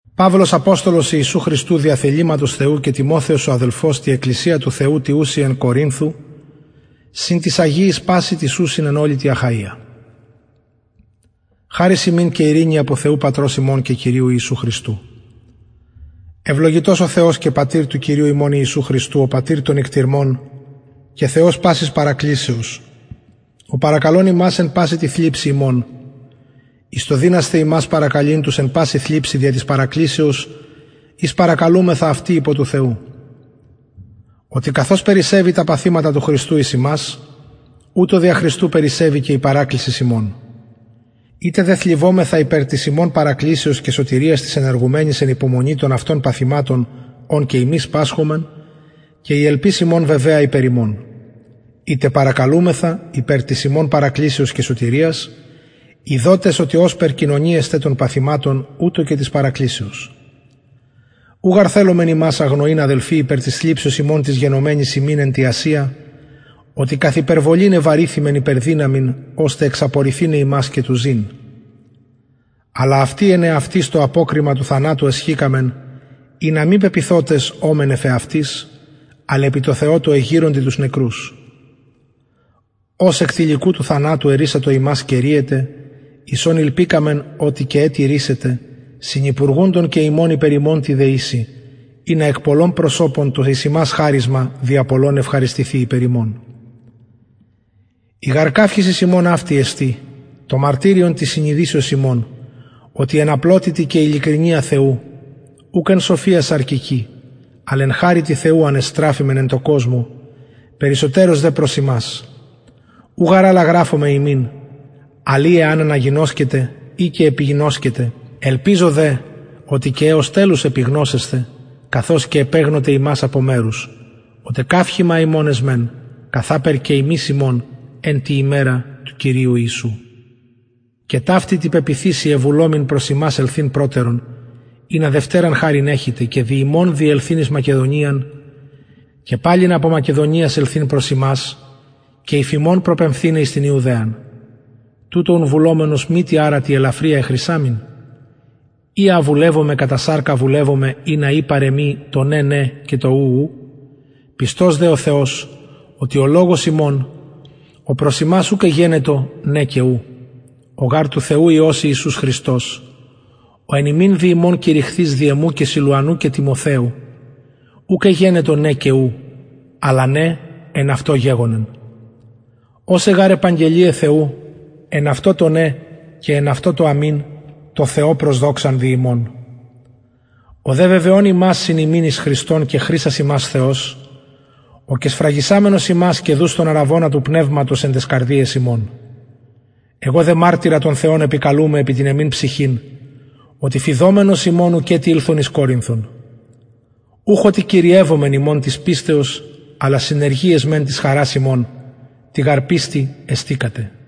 παυλος αποστολος ιησου χριστου δια θεληματος θεου και τιμοθεος ο αδελφος τη εκκλησια του θεου τη ουση εν κορινθω συν τοις αγιοις πασιν τοις ουσιν εν ολη τη αχαια χαρις υμιν και ειρηνη απο θεου πατρος ημων και κυριου ιησου χριστου ευλογητος ο θεος και πατηρ του κυριου ημων ιησου χριστου ο πατηρ των οικτιρμων και θεος πασης παρακλησεως ο παρακαλων ημας επι παση τη θλιψει ημων εις το δυνασθαι ημας παρακαλειν τους εν παση θλιψει δια της παρακλησεως ης παρακαλουμεθα αυτοι υπο του θεου οτι καθως περισσευει τα παθηματα του χριστου εις ημας ουτως δια του χριστου περισσευει και η παρακλησις ημων ειτε δε θλιβομεθα υπερ της υμων παρακλησεως και σωτηριας της ενεργουμενης εν υπομονη των αυτων παθηματων ων και ημεις πασχομεν και η ελπις ημων βεβαια υπερ υμων ειτε παρακαλουμεθα υπερ της υμων παρακλησεως και σωτηριας ειδοτες οτι ωσπερ κοινωνοι εστε των παθηματων ουτως και της παρακλησεως ου γαρ θελομεν υμας αγνοειν αδελφοι υπερ της θλιψεως ημων της γενομενης ημιν εν τη ασια οτι καθ υπερβολην εβαρηθημεν υπερ δυναμιν ωστε εξαπορηθηναι ημας και του ζην αλλα αυτοι εν εαυτοις το αποκριμα του θανατου εσχηκαμεν ινα μη πεποιθοτες ωμεν εφ εαυτοις αλλ επι τω θεω τω εγειροντι τους νεκρους ος εκ τηλικουτου θανατου ερρυσατο ημας και ρυεται εις ον ηλπικαμεν οτι και ετι ρυσεται συνυπουργουντων και υμων υπερ ημων τη δεησει ινα εκ πολλων προσωπων το εις ημας χαρισμα δια πολλων ευχαριστηθη υπερ υμων η γαρ καυχησις ημων αυτη εστιν το μαρτυριον της συνειδησεως ημων οτι εν απλοτητι και ειλικρινεια θεου ουκ εν σοφια σαρκικη αλλ εν χαριτι θεου ανεστραφημεν εν τω κοσμω περισσοτερως δε προς υμας ου γαρ αλλα γραφομεν υμιν αλλ η α αναγινωσκετε η και επιγινωσκετε ελπιζω δε οτι και εως τελους επιγνωσεσθε καθως και επεγνωτε ημας απο μερους οτι καυχημα υμων εσμεν καθαπερ και υμεις ημων εν τη ημερα του κυριου ιησου και ταυτη τη πεποιθησει εβουλομην ελθειν προς υμας το προτερον ινα δευτεραν χαριν εχητε και δι υμων διελθειν εις μακεδονιαν και παλιν απο μακεδονιας ελθειν προς υμας και υφ υμων προπεμφθηναι εις την ιουδαιαν τουτο ουν βουλευομενος μη τι αρα τη ελαφρια εχρησαμην η α βουλευομαι κατα σαρκα βουλευομαι ινα η παρ εμοι το ναι ναι και το ου ου πιστος δε ο θεος οτι ο λογος ημων ο προς υμας ουκ εγενετο ναι και ου ο γαρ του θεου υιος ιησους χριστος ο εν υμιν δι ημων κηρυχθεις δι εμου και σιλουανου και τιμοθεου ουκ εγενετο ναι και ου αλλα ναι εν αυτω γεγονεν οσαι γαρ επαγγελιαι θεου εν αυτω το ναι και εν αυτω το αμην τω θεω προς δοξαν δι ημων ο δε βεβαιων ημας συν υμιν εις χριστον και χρισας ημας θεος ο και σφραγισαμενος ημας και δους τον αρραβωνα του πνευματος εν ταις καρδιαις ημων εγω δε μαρτυρα τον θεον επικαλουμαι επι την εμην ψυχην οτι φειδομενος υμων ουκετι ηλθον εις κορινθον ουχ οτι κυριευομεν υμων της πιστεως αλλα συνεργοι εσμεν της χαρας υμων τη γαρ πιστει εστηκατε